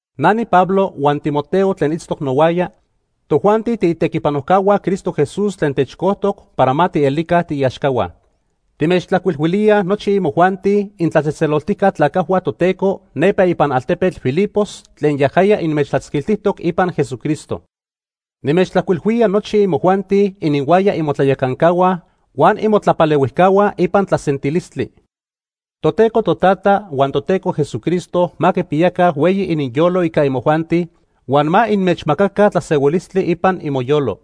Na niPablo huan Timoteo tlen itztoc nohuaya, tojuanti tiitequipanojcahua Cristo Jesús tlen techcojtoc para ma tielica tiiaxcahua. Timechtlajcuilhuilíaj nochi imojuanti intlatzejtzeloltijca tlacajhua Toteco nepa ipan altepetl Filipos tlen yajaya inmechtlatzquiltijtoc ipan Jesucristo. Nimechtlajcuilhuía nochi imojuanti ininhuaya imotlayacancahua huan imotlapalehuijcahua ipan tlasentilistli. Toteco Totata huan Toteco Jesucristo ma quipiyaca hueyi ininyolo ica imojuanti, huan ma inmechmacaca tlasehuilistli ipan imoyolo.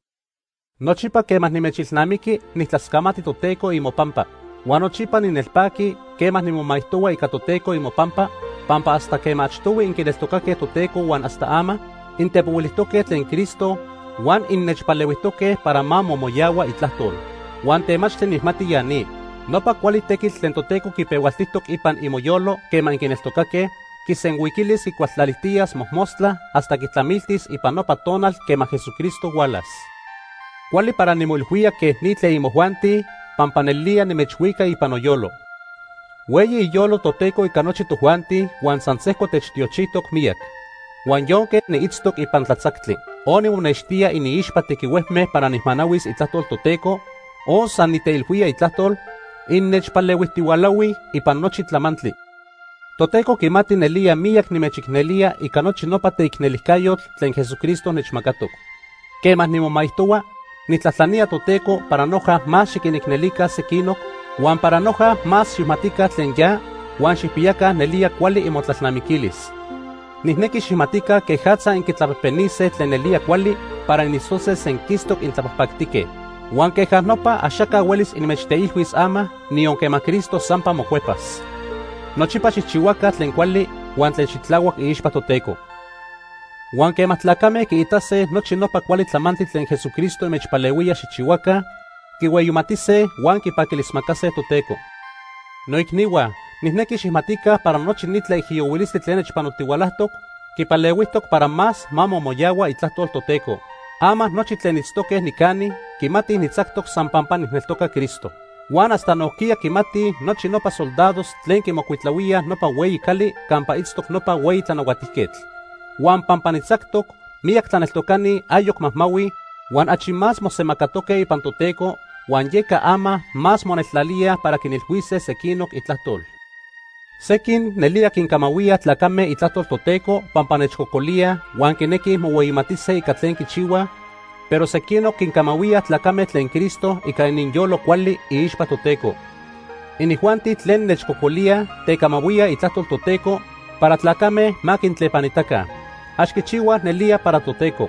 Nochipa quema nimechilnamiqui, nijtlascamati Toteco imopampa. Huan nochipa ninelpaqui quema nimomaijtohua ica Toteco imopampa, pampa hasta quema achtohui inquineltocaque Toteco huan hasta ama intepohuilijtoque tlen Cristo huan innechpalehuijtoque para ma momoyahua itlajtol. Huan temachtli nijmati ya ni. Nopa cuali tequitl tlen Toteco quipehualtijtoc ipan imoyolo quema inquineltocaque, quisenhuiquilis quicualtlalijtiyas mojmostla hasta quitlamiltis ipan nopa tonal quema Jesucristo hualas. Cuali para nimoilhuía quej ni tlen imojuanti pampa nelía nimechhuica ipan noyolo. Hueyi iyolo Toteco ica nochi tojuanti huan san sejco techtiochijtoc miyac. Huan yonque niitztoc ipan tlatzactli, o nimonextía iniixpa tequihuejme para nijmanahuis itlajtol Toteco, o san niteilhuía itlajtol, innechpalehuijtihualahuij ipan nochi tlamantli. Toteco quimati nelía miyac nimechicnelía ica nochi nopa teicnelijcayotl tlen Jesucristo nechmacatoc. Quema nimomaijtohua, nijtlajtlanía Toteco para noja más xiquinicnelica sequinoc, huan para noja más xijmatica tlen ya, huan xijpiyaca nelía cuali imotlalnamiquilis. Nijnequi xijmatica quejatza inquitlapejpenise tlen nelía cuali para initztose senquistoc intlapajpactique. Huan queja nopa axaca huelis inmechteilhuis ama, niyon quema Cristo sampa mocuepas. Nochipa xijchihuaca tlen cuali huan tlen xitlahuac iixpa Toteco. Huan quema tlacame quiitase nochi nopa cuali tlamantli tlen Jesucristo inmechpalehuía xijchihuaca, quihueyimatise huan quipaquilismacase Toteco. Noicnihua, nijnequi xijmatica para nochi ni tlaijiyohuilistli tlen nechpanotihualajtoc quipalehuijtoc para más ma momoyahua itlajtol Toteco. Ama nochi tlen itztoque nicani quimatij nitzactoc san pampa nijneltoca Cristo. Huan hasta nojquiya quimatij nochi nopa soldados tlen quimocuitlahuíaj nopa hueyi cali campa itztoc nopa hueyi tlanahuatijquetl. Huan pampa nitzactoc, miyac tlaneltocani ayoc majmahuij huan achi más mosemacatoque ipan Toteco, huan yeca ama más moneltlalíaj para quinilhuise sequinoc itlajtol. Sequin nelía quincamahuíaj tlacame itlajtol Toteco pampa nechcocolíaj huan quinequij mohueyimatise ica tlen quichihuaj, pero sequinoc quincamahuíaj tlacame tlen Cristo ica ininyolo cuali iixpa Toteco. Inijuanti tlen nechcocolíaj tecamahuíaj itlajtol Toteco para tlacame ma quintlepanitaca. Ax quichihuaj nelía para Toteco.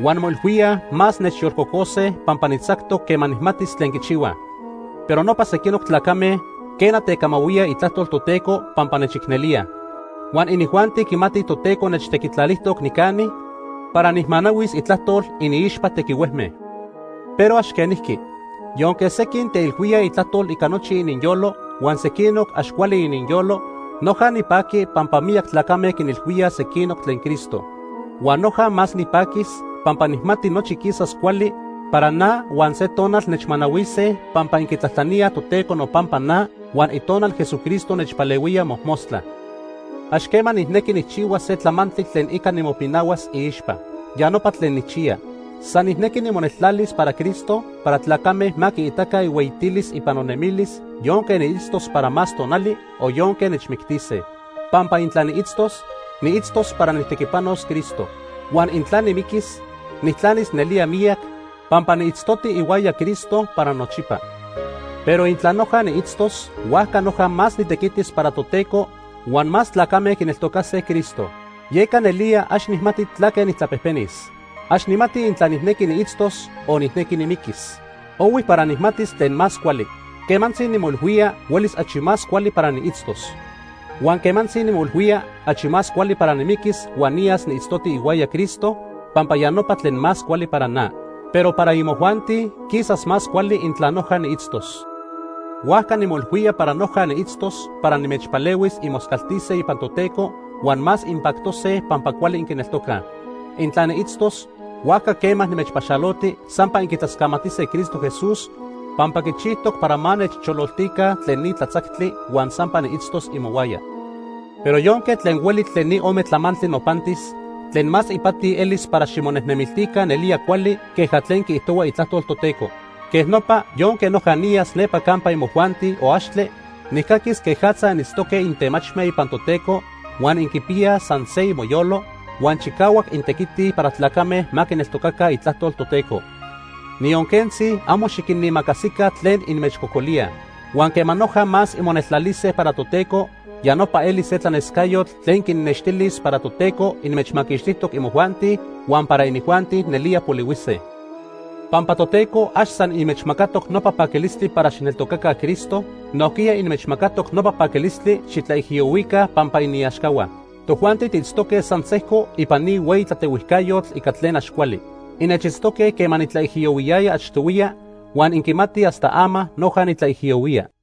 Huan moilhuíaj más nechyolcocose pampa nitzactoc quema nijmatis tlen quichihuaj. Pero nopa sequinoc tlacame, quena, tecamahuíaj itlajtol Toteco pampa nechicnelíaj. Huan inijuanti quimatij Toteco nechtequitlalijtoc nicani para nijmanahuis itlajtol iniixpa tequihuejme. Pero ax quenijqui. Yonque sequin teilhuíaj itlajtol ica nochi ininyolo huan sequinoc ax cuali ininyolo, noja nipaqui pampa miyac tlacame quinilhuíaj sequinoc tlen Cristo. Huan noja más nipaquis, pampa nijmati nochi quisas cuali para na huan se tonal nechmanahuise pampa inquitlajtlaníaj Toteco nopampa na huan Itonal Jesucristo nechpalehuía mojmostla. Ax quema nijnequi nijchihuas se tlamantli tlen ica nimopinahuas iixpa. Ya nopa tlen nijchiya. San nijnequi nimoneltlalis para Cristo para tlacame ma quiitaca ihueyitilis ipan nonemilis yonque niitztos para más tonali o yonque nechmictise. Pampa intla niitztos, niitztos para nijtequipanos Cristo. Huan intla nimiquis, nijtlanis nelía miyac, pampa niitztoti ihuaya Cristo para nochipa. Pero intla noja niitztos, huajca noja más nitequitis para Toteco huan más tlacame quineltocase Cristo. Yeca nelía ax nijmati tlaque nijtlapejpenis. Ax nijmati intla nijnequi niitztos o nijnequi nimiquis. Ohui para nijmatis tlen más cuali. Quemantzi nimoilhuía huelis achi más cuali para niitztos. Huan quemantzi nimoilhuía achi cuali para nimiquis huan niyas niitztoti ihuaya Cristo pampa ya nopa tlen más cuali para na. Pero para imojuanti quisas más cuali intla noja niitztos. Huajca nimoilhuía para noja niitztos para nimechpalehuis inmoscaltise ipan Toteco huan más inpactose pampa cuali inquineltocaj. Intla niitztos, huajca quema nimechpaxaloti, sampa inquitlascamatise Cristo Jesús pampa quichijtoc para ma nechchololtica tlen ni tlatzactli huan sampa niitztos imohuaya. Pero yonque tlen hueli tlen ni ome tlamantli nopantis, tlen más ipati elis para ximonejnemiltica nelía cuali queja tlen quiijtohua itlajtol Toteco. Quej nopa yonque noja niyas nepa campa imojuanti o axtle, nijcaquis quejatza initztoque intemachme ipan Toteco, huan inquipiyaj san se imoyolo, huan chicahuac intequitij para tlacame ma quineltocaca itlajtol Toteco. Niyon quentzi amo xiquinimacasica tlen inmechcocolíaj. Huan quema noja más inmoneltlalise para Toteco, ya nopa elis se tlanescayotl tlen quinnextilis para Toteco inmechmaquixtijtoc imojuanti huan para inijuanti nelía polihuise. Pampa Toteco ax san inmechmacatoc nopa paquilistli para xijneltocaca Cristo, nojquiya inmechmacatoc nopa paquilistli xitlaijiyohuica pampa iniaxcahua. Tojuanti tiitztoque san sejco ipan ni hueyi tlatehuijcayotl ica tlen ax cuali. Innechitztoque quema nitlaijiyohuiyaya achtohuiya huan inquimatij hasta ama noja nitlaijiyohuía.